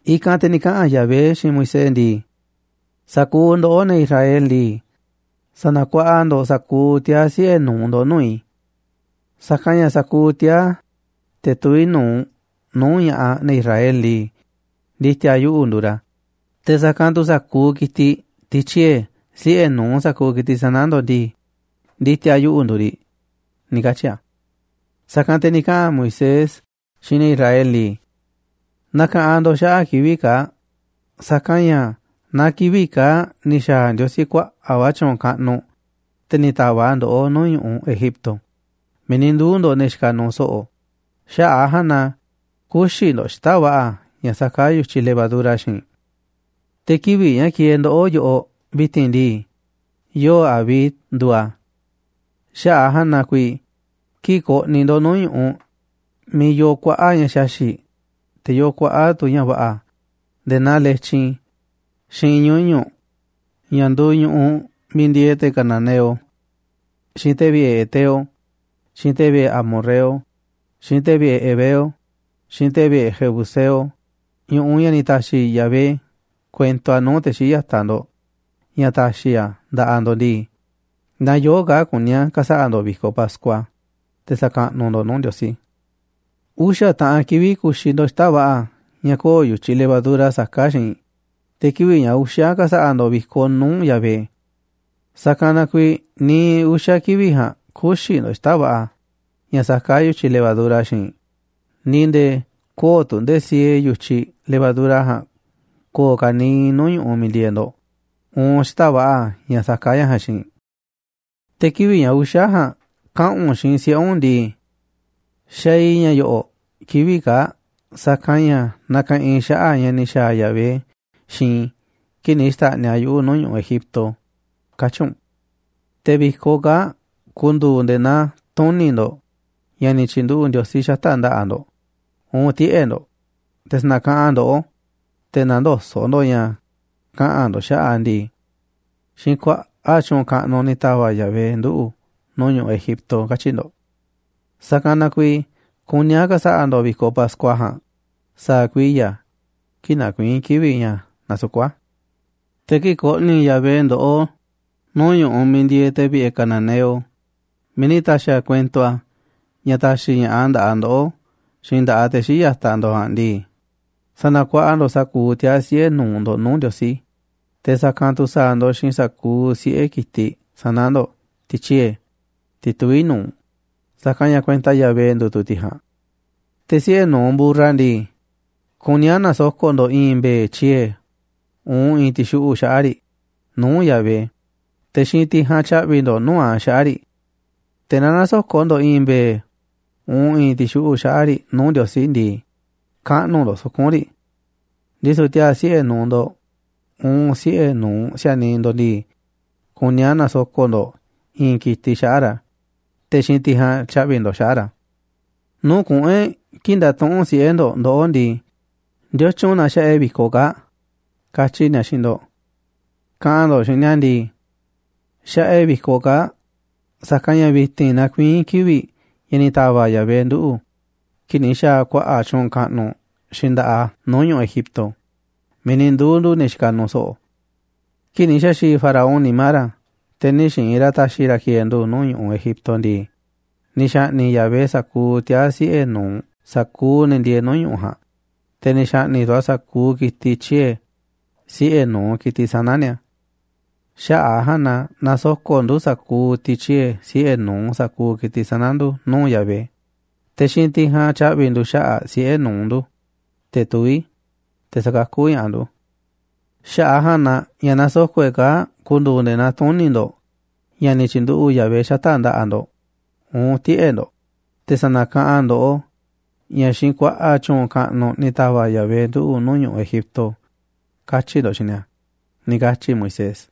I̱kanꞌ te̱ ni̱ kaꞌa̱n Yahvé xiinꞌ Moisés ndii: ―Sa̱kuuꞌ ndoꞌó, ne̱ Israel ndii, sa̱na̱kuaꞌa ndo̱ꞌ sa̱kuuꞌ tiaa̱ siꞌe̱ nu̱uꞌ ndo̱ꞌ nuu̱ꞌ i̱. Sa̱kanꞌ ña̱ sa̱kuuꞌ tiaa̱, te̱ tuví nu̱uꞌ nuu̱ꞌ ña̱ꞌaꞌ ne̱ Israel ndii, ndi̱ti̱a̱ yuꞌu̱ nduuꞌ ra̱. Te̱ sa̱kanꞌ tu̱ sa̱kuuꞌ ki̱tiꞌ, tiꞌ tyiee̱ siꞌe̱ nu̱uꞌ sa̱kuuꞌ ki̱tiꞌ sana̱ ndo̱ꞌ ndii, ndi̱ti̱a̱ yuꞌu̱ nduuꞌ riꞌ ―ni̱ katyi̱ a̱. Sa̱kanꞌ te̱ ni̱ kaꞌa̱n Moisés xiinꞌ ne̱ Israel ndii: ―Na̱ka̱ꞌanꞌ ndo̱ꞌ xaꞌa̱ꞌ kivi̱ꞌ kaa̱ꞌ, sa̱kanꞌ ña̱ naa kivi̱ꞌ kaa̱ꞌ ni̱ xa̱a̱ Ndiosí kuaꞌa̱ꞌ va̱ tyu̱u̱n kaꞌnuꞌ, te̱ ni̱ ta̱va̱ꞌ a̱ ndoꞌó nuu̱ꞌ ñu̱ꞌuꞌ Egipto miiꞌ ni̱ nduu̱ ndo̱ꞌ ne̱ xikaꞌ nuuꞌ so̱ꞌo̱. Xaꞌa̱ꞌ a̱ ja̱a̱nꞌ na kü̱xi̱ ndo̱ꞌ xita̱ꞌ va̱ꞌa̱ ña̱ saká yu̱tyiꞌ levadura xiinꞌ. Te̱ kivi̱ꞌ ña̱ kieeꞌ ndoꞌó yoꞌoꞌ vi̱ti̱n ndii, yoo̱ꞌ Abib nduuꞌ a̱. Xaꞌa̱ꞌ a̱ ja̱a̱nꞌ na kuiiꞌ kii̱ꞌ ko̱ꞌni̱ ndo̱ꞌ nuu̱ꞌ ñu̱ꞌuꞌ miiꞌ yoo kuaꞌa̱ꞌ ña̱ xaxi̱ꞌ, te̱ yoo kuaꞌa̱ꞌ tu̱ ña̱ va̱ꞌa̱ nde̱e̱ naa letyin xiinꞌ ñuñu̱ꞌ ña̱ nduuꞌ ñu̱ꞌuꞌ miiꞌ ndieeꞌ te̱ cananeo, xiinꞌ te̱ vi̱ꞌe̱ heteo, xiinꞌ te̱ vi̱ꞌe̱ amorreo, xiinꞌ te̱ vi̱ꞌe̱ heveo, xiinꞌ te̱ vi̱ꞌe̱ jebuseo, ñu̱ꞌuꞌ ña̱ ni̱ ta̱xi̱ Yahvé kuento a̱ nuu̱ꞌ te̱ xii̱ꞌ ya̱taꞌ ndo̱ꞌ ña̱ ta̱xi̱ a̱ nda̱ꞌaꞌ ndo̱ꞌ ndii, naa yoo̱ꞌ kaa̱ꞌ kuní a̱ ka̱sa̱ꞌa̱ ndo̱ꞌ vi̱koꞌ Pascua, te̱ sa̱kaꞌnuꞌ ndo̱ꞌ nuu̱ꞌ Ndiosí. Uxa̱ taꞌan kivi̱ꞌ ku̱xi̱ ndo̱ꞌ xita̱ꞌ va̱ꞌa̱ ña̱ köo̱ꞌ yu̱tyiꞌ levadura saká xiinꞌ, te̱ kivi̱ꞌ ña̱ uxa̱ ka̱sa̱ꞌa̱ ndo̱ꞌ vi̱koꞌ nuu̱ꞌ Yahvé. Sa̱kanꞌ na kuiiꞌ niiꞌ uxa̱ kivi̱ꞌ ja̱a̱nꞌ kü̱xi̱ ndo̱ꞌ xita̱ꞌ va̱ꞌa̱ ña̱ saká yu̱tyiꞌ levadura xiinꞌ, ni̱ nde̱e̱ köo̱ꞌ tu̱ nde̱e̱ siee yu̱tyiꞌ levadura ja̱a̱nꞌ ko̱o̱ ka̱niiꞌ nuu̱ꞌ ñu̱ꞌuꞌ miiꞌ ndieeꞌ ndo̱ꞌ uun xita̱ꞌ va̱ꞌa̱ ña̱ saká ña̱ ja̱a̱nꞌ xiinꞌ. ’Te̱ kivi̱ꞌ ña̱ uxa̱ ja̱a̱nꞌ kaꞌa̱n u̱nꞌ xiinꞌ siꞌe̱ u̱nꞌ ndii: “Xaaꞌ i̱ ña̱ yo̱ꞌo̱ꞌ kivi̱ꞌ kaa̱ꞌ sa̱kanꞌ ña̱ nakaꞌanꞌ i̱ xaꞌa̱ꞌ ña̱ ni̱ xa̱a̱ Yahvé xiinꞌ i̱ kii̱ꞌ ni̱ xta̱ꞌniꞌ a̱ yuꞌu̱ nuu̱ꞌ ñu̱ꞌuꞌ Egipto”, katyi̱ u̱nꞌ. Te̱ vi̱koꞌ kaa̱ꞌ ku̱ndu̱u̱ nde̱e̱ naa tuni̱ ndo̱ꞌ ña̱ ni̱ tyi̱nduꞌu̱ꞌ Ndiosí xata̱ꞌ nda̱ꞌaꞌ ndo̱ꞌ uun tiꞌe̱ ndo̱ꞌ, te̱ sa̱na̱kaꞌanꞌ a̱ ndoꞌó, te̱ nä̱ndoso̱ꞌ ndo̱ꞌ ña̱ kaꞌa̱n ndo̱ꞌ xaꞌa̱ꞌ a̱ ndii: “Xiinꞌ kuaꞌa̱ꞌ tyu̱u̱n kaꞌnuꞌ ni̱ ta̱va̱ꞌ Yahvé nduꞌu̱ nuu̱ꞌ ñu̱ꞌuꞌ Egipto”, katyi̱ ndo̱ꞌ. Sa̱kanꞌ na kuiiꞌ kuní a̱ ka̱sa̱ꞌa̱ ndo̱ꞌ vi̱koꞌ Pascua ja̱a̱nꞌ sa̱a̱ kuiya̱ kii̱ꞌ nakuiín kivi̱ꞌ ña̱ nasukú a̱. ’Te̱ kii̱ꞌ ko̱ꞌni̱ Yahvé ndoꞌó nuu̱ꞌ ñu̱ꞌuꞌ miiꞌ ndieeꞌ te̱ vi̱ꞌe̱ cananeo, miiꞌ ni̱ ta̱xi̱ a̱ kuento a̱ ña̱ ta̱xi̱ ña̱ꞌaꞌ nda̱ꞌaꞌ ndoꞌó xiinꞌ nda̱ꞌaꞌ te̱ xii̱ꞌ ya̱taꞌ ndo̱ꞌ ja̱a̱nꞌ ndii, sa̱na̱kuaꞌa ndo̱ꞌ sa̱kuuꞌ tiaa̱ siꞌe̱ nu̱uꞌ ndo̱ꞌ nuu̱ꞌ Ndiosí, te̱ sa̱kanꞌ tu̱ sa̱a̱ ndo̱ꞌ xiinꞌ sa̱kuuꞌ siꞌe̱ ki̱tiꞌ sana̱ ndo̱ꞌ, tiꞌ tyiee̱, tiꞌ tuví nu̱uꞌ, sa̱kanꞌ ña̱ kuenta Yahvé nduuꞌ tu̱ tiꞌ ja̱a̱nꞌ. Te̱ siꞌe̱ nu̱uꞌ mburra ndii, kuní a̱ na̱soko̱ꞌ ndo̱ꞌ i̱i̱n mbe̱e̱ tyiee̱ uun i̱i̱n ti̱xuꞌu̱ꞌ xaꞌa̱ꞌ riꞌ nuu̱ꞌ Yahvé, te̱ xiinꞌ tiꞌ ja̱a̱nꞌ tya̱ꞌvi̱ ndo̱ꞌ nuu̱ꞌ a̱ xaꞌa̱ꞌ riꞌ. Te̱ naaꞌ nä̱soko̱ꞌ ndo̱ꞌ i̱i̱n mbe̱e̱ uun i̱i̱n ti̱xuꞌu̱ꞌ xaꞌa̱ꞌ riꞌ nuu̱ꞌ Ndiosí ndii, kaꞌnu̱ ndo̱ꞌ suku̱nꞌ riꞌ. Ndisu̱ tiaa̱ siꞌe̱ nu̱uꞌ ndo̱ꞌ uun siꞌe̱ nu̱uꞌ si̱a̱niꞌ ndo̱ꞌ ndii, kuní a̱ na̱soko̱ꞌ ndo̱ꞌ i̱i̱n ki̱tiꞌ xaꞌa̱ꞌ ra̱, te̱ xiinꞌ tiꞌ ja̱a̱nꞌ tya̱ꞌvi̱ ndo̱ꞌ xaꞌa̱ꞌ ra̱. ’Nuu̱ꞌ kuꞌu̱n e̱ꞌ kii̱ꞌ nda̱tuꞌu̱nꞌ siꞌe̱ ndo̱ꞌ ndoꞌó ndii: “¿Ndiotyun na xaꞌa e̱ꞌ vi̱koꞌ kaa̱ꞌ?”, katyi̱ ni̱a̱ xiinꞌ ndo̱ꞌ. Kaꞌa̱n ndo̱ꞌ xiinꞌ ni̱a̱ ndii: “Xaꞌa e̱ꞌ vi̱koꞌ kaa̱ꞌ sa̱kanꞌ ña̱ vi̱ti̱n nakuiín kivi̱ꞌ ña̱ ni̱ ta̱va̱ꞌ Yahvé nduꞌu̱ kii̱ꞌ ni̱ xa̱a̱ a̱ kuaꞌa̱ꞌ tyu̱u̱n kaꞌnuꞌ xiinꞌ nda̱ꞌaꞌ a̱ nuu̱ꞌ ñu̱ꞌuꞌ Egipto miiꞌ ni̱ nduu̱ ndu̱ ne̱ xikaꞌ nuuꞌ so̱ꞌo̱. Kii̱ꞌ ni̱ xa̱xi̱i̱ Faraón nimá ra̱, te̱ nï̱ xi̱i̱n ra̱ ta̱xi̱ ra̱ ki̱e̱e̱ ndu̱ nuu̱ꞌ ñu̱ꞌuꞌ Egipto ndii, ni̱ xa̱ꞌni̱ꞌ Yahvé sa̱kuuꞌ tiaa̱ siꞌe̱ nu̱uꞌ sa̱kuuꞌ ne̱ ndieeꞌ nuu̱ꞌ ñu̱ꞌuꞌ ja̱a̱nꞌ, te̱ ni̱ xa̱ꞌni̱ꞌ tu̱ a̱ sa̱kuuꞌ ki̱tiꞌ tyiee̱ siꞌe̱ nu̱uꞌ ki̱tiꞌ sana̱ ni̱a̱. Xaꞌa̱ꞌ a̱ ja̱a̱nꞌ na nasoko̱ꞌ ndu̱ sa̱kuuꞌ tiꞌ tyiee̱ siꞌe̱ nu̱uꞌ sa̱kuuꞌ ki̱tiꞌ sana̱ ndu̱ nuu̱ꞌ Yahvé, te̱ xiinꞌ tiꞌ ja̱a̱nꞌ tyaꞌvi̱ ndu̱ xaꞌa̱ꞌ siꞌe̱ nu̱uꞌ ndu̱, te̱ tuví, te̱ sa̱kakú ña̱ꞌaꞌ ndu̱. Xaꞌa̱ꞌ a̱ ja̱a̱nꞌ na ña̱ nasoko̱ꞌ e̱ꞌ kaa̱ꞌ ku̱ndu̱u̱ nde̱e̱ naa tuni̱ ndo̱ꞌ ña̱ ni̱ tyi̱nduꞌu̱ꞌ Yahvé xata̱ꞌ nda̱ꞌaꞌ ndo̱ꞌ uun tiꞌe̱ꞌ ndo̱ꞌ, te̱ sa̱na̱kaꞌanꞌ a̱ ndoꞌó ña̱ xiinꞌ kuaꞌa̱ꞌ tyu̱u̱n kaꞌnuꞌ ni̱ ta̱va̱ꞌ Yahvé nduꞌu̱ nuu̱ꞌ ñu̱ꞌuꞌ Egipto”, katyi̱ ndo̱ꞌ xiinꞌ ni̱a̱ ―ni̱ katyi̱ Moisés.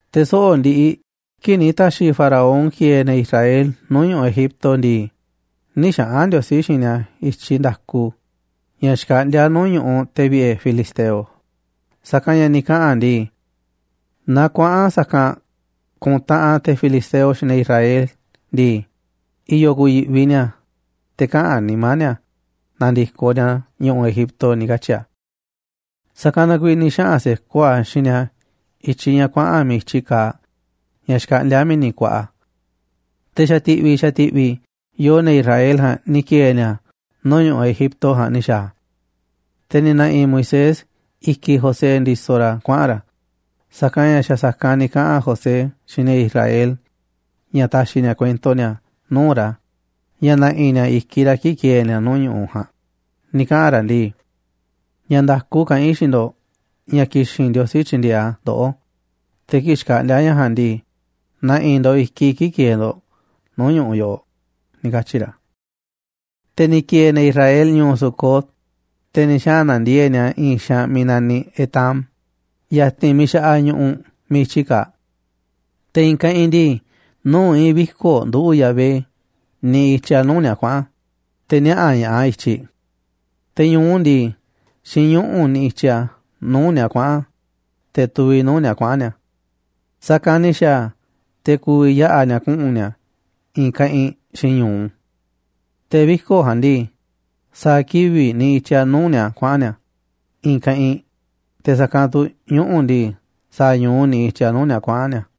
Te̱ soꞌo̱ꞌ ndiꞌiꞌ kii̱ꞌ ni̱ ta̱xi̱ faraón ki̱e̱e̱ ne̱ Israel nuu̱ꞌ ñu̱ꞌuꞌ Egipto ndii, nï̱ xaꞌa̱n Ndiosí xiinꞌ ni̱a̱ i̱tyiꞌ nda̱ku ña̱ xkaꞌndíá nuu̱ꞌ ñu̱ꞌuꞌ te̱ vi̱ꞌe̱ filisteo, sa̱kanꞌ ña̱ ni̱ kaꞌa̱n a̱ ndii: “Naaꞌ kuaꞌa̱n sa̱kanꞌ ku̱ntaꞌanꞌ te̱ filisteo xiinꞌ ne̱ Israel ndii, i̱yo̱ ku̱yi̱ꞌvi ni̱a̱, te̱ kaꞌa̱n nimá ni̱a̱ na̱ndi̱koꞌ ni̱a̱ ñu̱ꞌuꞌ Egipto”, ni̱ katyi̱ a̱. Sa̱kanꞌ na kuiiꞌ ni̱ xaꞌa̱n se̱koꞌ a̱ xiinꞌ ni̱a̱ i̱tyiꞌ ña̱ kuaꞌa̱n miiꞌ i̱tyi kaaꞌ, ña̱ xkaꞌndíá Mi̱ni̱ Kuaꞌa. Te̱ xa̱ ti̱ꞌvi̱ xa̱ ti̱ꞌvi̱ yoo ne̱ Israel ja̱a̱nꞌ ni̱ ki̱e̱e̱ ni̱a̱ nuu̱ꞌ ñu̱ꞌuꞌ Egipto ja̱a̱nꞌ ni̱ xa̱a̱ a̱. Te̱ ni̱ na̱ꞌi̱ Moisés i̱kiꞌ José ndisoꞌ ra̱ kuaꞌa̱n ra̱, sa̱kanꞌ ña̱ xa̱ sa̱kanꞌ ni̱ kaꞌa̱n José xiinꞌ ne̱ Israel ña̱ ta̱xi̱ ni̱a̱ kuento ni̱a̱ nuu̱ꞌ ra̱ ña̱ na̱ꞌi̱ ni̱a̱ i̱kiꞌ ra̱ kii̱ꞌ ki̱e̱e̱ ni̱a̱ nuu̱ꞌ ñu̱ꞌuꞌ ja̱a̱nꞌ, ni̱ kaꞌa̱n ra̱ ndii: “Ña̱ nda̱ku kaꞌán i̱ xiinꞌ ndo̱ꞌ ña̱ ki̱xi̱n Ndiosí tyi̱ndi̱e̱eꞌ a̱ ndoꞌó, te̱ kii̱ꞌ xkaꞌndi̱a̱ ña̱ ja̱a̱nꞌ ndii, na̱ꞌi̱ ndo̱ꞌ i̱kiꞌ i̱ kii̱ꞌ ki̱e̱e̱ ndo̱ꞌ nuu̱ꞌ ñu̱ꞌuꞌ yoꞌoꞌ”, ni̱ katyi̱ ra̱. Te̱ ni̱ ki̱e̱e̱ ne̱ Israel ñu̱u̱ Sucot, te̱ ni̱ xaꞌa̱n na̱ndiee̱ꞌ ni̱a̱ i̱i̱n xaanꞌ miiꞌ naniꞌ Etam, ya̱ti̱n miiꞌ xa̱ꞌaꞌ ñu̱ꞌuꞌ miiꞌ i̱tyi kaaꞌ. Te̱ i̱i̱n keꞌinꞌ ndii, nuu̱ꞌ i̱i̱n viko̱ꞌ nduꞌu̱ꞌ Yahvé niꞌiꞌ i̱tyiꞌ a̱ nuu̱ꞌ ni̱a̱ kuaꞌa̱n a̱, te̱ niaꞌa̱ ña̱ꞌaꞌ a̱ i̱tyiꞌ. Te̱ ñu̱u ndii, xiinꞌ ñuꞌu̱ niꞌiꞌ i̱tyiꞌ a̱ nuu̱ꞌ ni̱a̱ kuaꞌa̱n a̱, te̱ tuviꞌ nuu̱ꞌ ni̱a̱ kuaꞌa̱n ni̱a̱. Sa̱kanꞌ ni̱ xa̱a̱ a̱ te̱ ku̱vi̱ yaꞌa̱ ni̱a̱ kuꞌu̱n ni̱a̱ i̱i̱n keꞌinꞌ xiinꞌ ñu̱u. Te̱ viko̱ꞌ ja̱a̱nꞌ ndii, sa̱a̱ kivi̱ꞌ niꞌiꞌ i̱tyiꞌ a̱ nuu̱ꞌ ni̱a̱ kuaꞌa̱n ni̱a̱ i̱i̱n keꞌinꞌ, te̱ sa̱kanꞌ tu̱ ñuꞌu̱ ndii, sa̱a̱ ñu̱u niꞌiꞌ i̱tyiꞌ a̱ nuu̱ꞌ ni̱a̱ kuaꞌa̱n ni̱a̱.